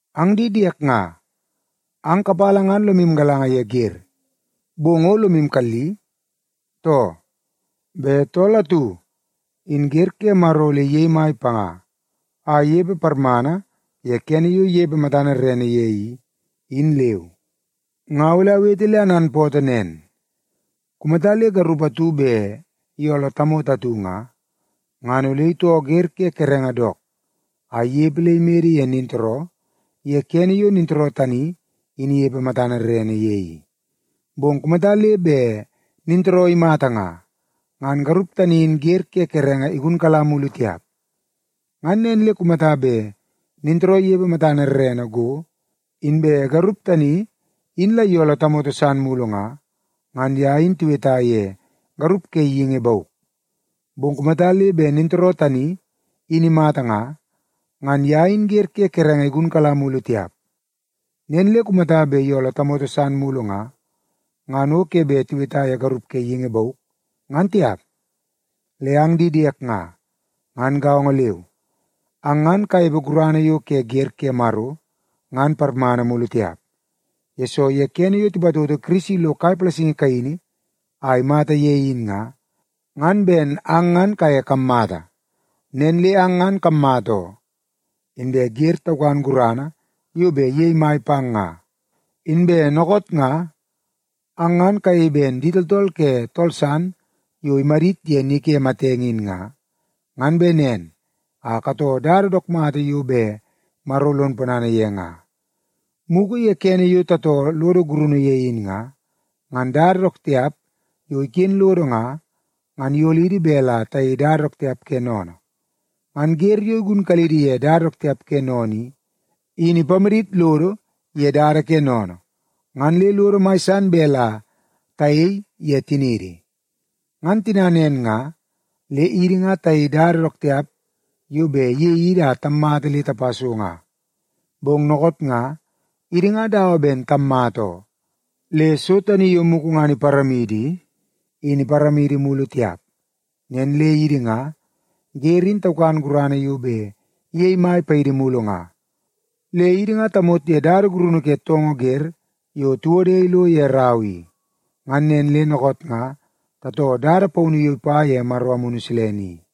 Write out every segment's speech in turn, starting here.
Ang di diek nga, ang kapala ngan lomu galanga ye wer, bong o lomu kalli, too? Bet tool atu, in wer ke Maro ole iyei mai panga a inepe parmana ye kene yo inepe matana rerene ye i, in leu. Nga ole awete le ananpootoo nen. Kumata le garup atu bet iyooloo tamoto atu nga, ngan ole itoo wer ke kerenge dook a inepe le imede ye nintooroo ye kene yo nintooroo tani in inepe matana rerene ye i. Bong kumata le bet nintooroo imata nga, ngan garup tani in wer ke kerenge igunkala mulu tiap. Ngan nen le kumata bet nintooroo inepe matana rerene go, inbe garup tani in la iyooloo tamoto san mulu nga, ngan ye in tiweta ye garup ke geingi bauk. Bong kumata le bet nintooroo tani in imata nga, ngan ye in wer ke kerenge igunkala mulu tiap. Nen le kumata bet iyooloo tamoto san mulu nga, ngan o ke bet tiweta ye garup ke geingi bauk, ngan tiap. Le ang di diek nga, ngan gaongo leu, ang ngan kanepe gurana yo ke wer ke Maro ngan parmana mulu tiap, yesoo ye kene yo tipatoto Kirisi lo kai palasingi kaini a imata ye in nga, ngan ben ang ngan kaye kammata. Nen le ang ngan kammata oo, inbe wer taukan gurana yo bet iyei mai pang nga. Inbe dookoot nga, ang ngan kayei ben di tooltool ke tool san yo imadit ye ni ke matenge in nga, ngan bet nen a katoo dada dook mata yo bet Maro lon ponana ye nga. Mugu ye kene yo tatoo lodo gurunu ye in nga, ngan dada dook tiap yo iken lodo nga, ngan iyolidi bet la tayei dada dook tiap ke sennene. Ngan wer yo igunkalidi ye dada dook tiap ke sennene i, in ipamadit lodo ye dada ke sennene, ngan le lodo mai san bet la tayei ye tiniidi. Ngan tina nen nga, le idi nga tayei dada dook tiap yo bet iyei idi a tammata le tapa so nga. Bong dookoot nga, idi nga dawa ben tammata oo, le so tani yo mugu ngan iparamidi i, in iparamidi mulu tiap. Nen le idi nga, wer in taukan gurana yo bet iyei mai paidi mulu nga, le idi nga tamot ye dada gurunu ke toongoo wer yo tiwode ilo ye rau i. Ngan nen le dookoot nga tatoo dada paunu yo ipa ye Maro Amunu Silene i.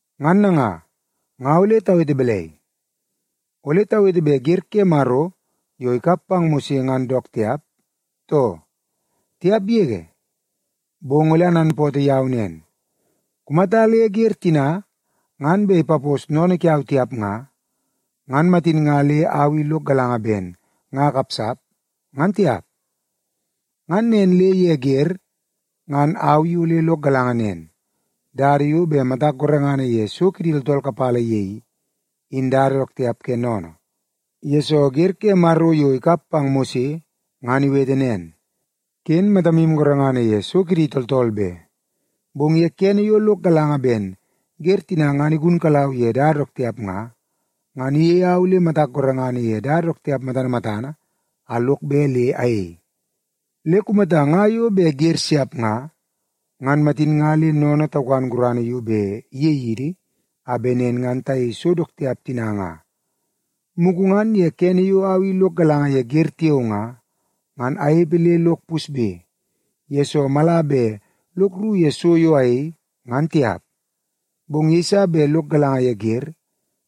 Ngan nanga, nga ole tawete balai? Ole tawete bet wer ke Maro yo ikap pang Mose ngan dook tiap, too? Tiap yege! Bong ole ananpootoo yau nen, kumata le wer tina ngan bet ipapos sennene kiau tiap nga, ngan matin nga le au i lok galanga ben nga akapsap, ngan tiap. Ngan nen le ye wer, ngan au i ole lok galanga nen, dada yo bet matak gorengana ye so kidi tooltool kapala ye i, in dada dook tiap ke sennene, yesoo wer ke Maro yo ikap pang Mose ngan iwete nen, “Ken matamu gorengana ye so kidi tooltool be.” Bong ye kene yo lok galanga ben wer tina ngan igunkalau ye dada dook tiap nga, ngan iyei au le matak gorengana ye dada dook tiap matana matana a lok bet le ayei. Le kumata nga yo bet wer siap nga, ngan matin nga le sennene taukan gurana yo bet iyei idi, a bet nen ngan tayei so dook tiap tina nga. Mugu ngan ye kene yo au i lok galanga ye wer tiao nga, ngan anepe le lok pusbe, yesoo mala bet lok rru ye so yo ayei, ngan tiap. Bong yeiso bet lok galanga ye wer,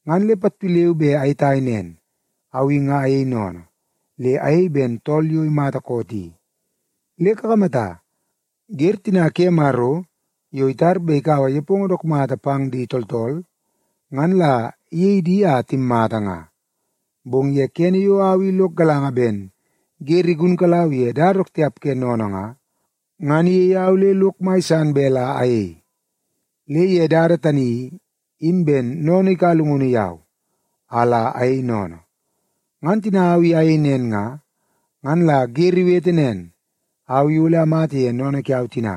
ngan le pattu leu be ayetai nen, au i nga ayei sennene, le ayei ben tool yo imata koot i. Le kakamata, wer tina ke Maro yo itar bet ikaua nepongo dook mata pang di tooltool, ngan la iyei di a timmata nga. Bong ye kene yo au i lok galanga ben wer igunkalau ye dada dook tiap ke sennene nga, ngan iyei au le lok mai san bet la ayei. Le ye dada tani i, in ben sennene ikaua llungunu yau, a la ayei sennene. Ngan tina au i ayei nen nga, ngan la wer iwete nen, au i ole amata ye sennene kiau tina.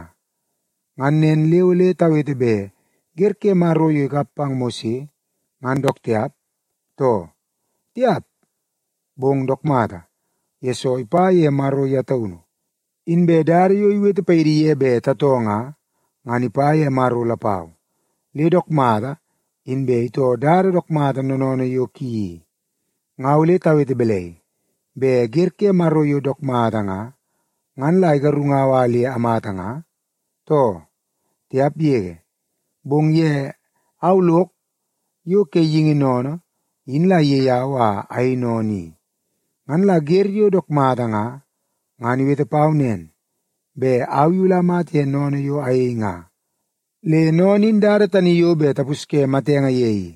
Ngan nen le ole tawete bet wer ke Maro yo ikap pang Mose ngan dook tiap, too? Tiap! Bong dook mata, yesoo ipa ye Maro ye taunu. Inbe dada yo iwete paidi ye bet tatoo nga, ngan ipa ye Maro lapau, le dook mata inbe itoo dada dook mata noonoonoo yo ki i. Nga ole tawete balai? Bet wer ke Maro yo dook mata nga, ngan la igarungau a le amata nga, too? Tiap yege! Bong ye au lok yo ke geingi sennene in la iyei au a ayei sennene i. Ngan la wer yo dook mata nga, ngan iwete pau nen, bet au i ole amata ye sennene yo ayei nga. Le sennene in dada tani yo bet tapusye matenge ye i.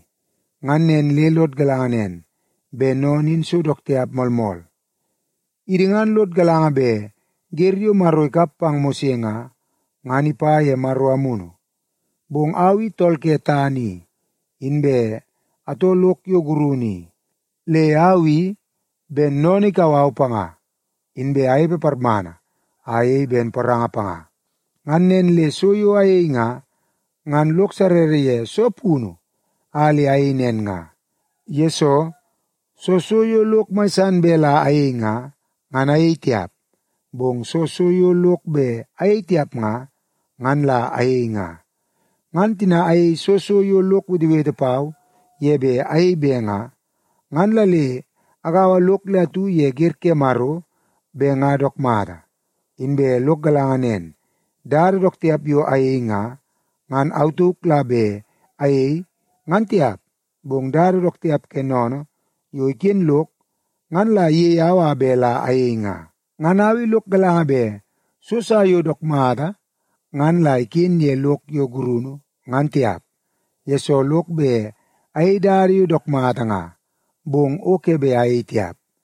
Ngan nen le lod galanga nen, bet sennene in so dook tiap moolmool. Idi ngan lod galanga bet wer yo Maro ikap pang Mose nga, ngan ipa ye Maro Amunu, bong au i tool ke tana i, inbe atoo lok yo gurunu i. Le au i, ben sennene ikau au panga, inbe anepe parmana a ayei ben poranga panga. Ngan nen le so yo ayei nga, ngan lok sarrara ye soo punu a le ayei nen nga. Yesoo, soo so yo lok mai san bet la ayei nga, ngan ayei tiap, bong soo so yo lok bet ayei tiap nga, ngan la ayei nga. Ngan tina ayei soo so yo lok wetewete pau ye bet ayei be nga, ngan la le agaua lok le atu ye wer ke Maro bet nga dook mata. Inbe lok galanga nen, dada dook tiap yo ayei nga, ngan au tauk la bet ayei ngan tiap, bong dada dook tiap ke sennene yo iken lok ngan la iyei au a bet la ayei nga. Ngan au i lok galanga bet so sa yo dook mata ngan la iken ye lok yo gurunu, ngan tiap, yesoo lok bet ayei dada yo dook mata nga, bong o ke bet ayei tiap.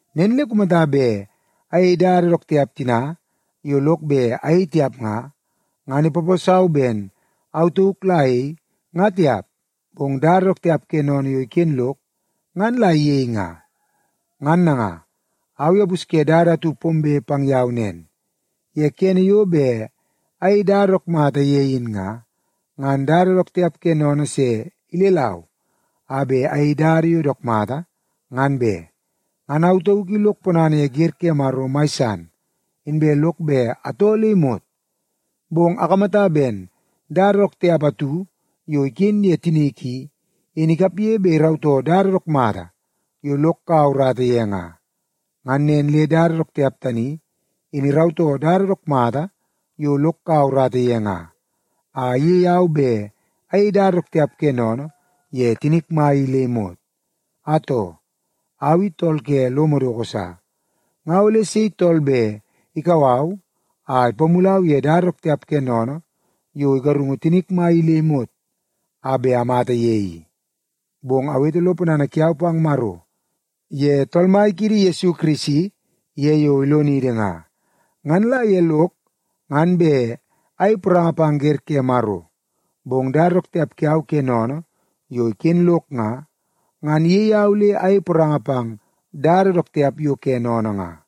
Nen le kumata bet ayei dada dook tiap tina yo lok bet ayei tiap nga, ngan ipaposau ben au tauk la ayei, nga tiap, bong dada dook tiap ke sennene yo iken lok ngan la iyei nga. Ngan nanga, au i apusye dada atu pombe pang yau nen. Ye kene yo bet ayei dada dook mata ye in nga, ngan dada dook tiap ke sennene se ilelau a bet ayei dada yo dook mata, ngan be. Ngan au tauk i lok ponana ye wer ke Maro mai san, inbe lok bet atoo le imot. Bong akamata ben dada dook tiap atu yo iken ye tinik i, in ikapge bet irautoo dada dook mata yo lok kaua urata ye nga. Ngan nen le dada dook tiap tani in irautoo dada dook mata yo lok kaua urata ye nga, a iyei au bet ayei dada dook tiap ke sennene ye tinik mai i le imot. Atoo, au i tool ke lo madoko sa! Nga ole sei tool bet ikau au a ipamulau ye dada dook tiap ke sennene yo igarungu tinik mai i le imot a bet amata ye i? Bong awete lo ponana kiau pang Maro ye Tool Mai kiidi Yesu Kirisi ye yo ilonidi nga. Ngan la ye lok ngan bet ayei poranga pang wer ke Maro, bong dada dook tiap kiau ke sennene yo iken lok nga, ngan iyei au le ayei poranga pang dada dook tiap yo ke sennene nga.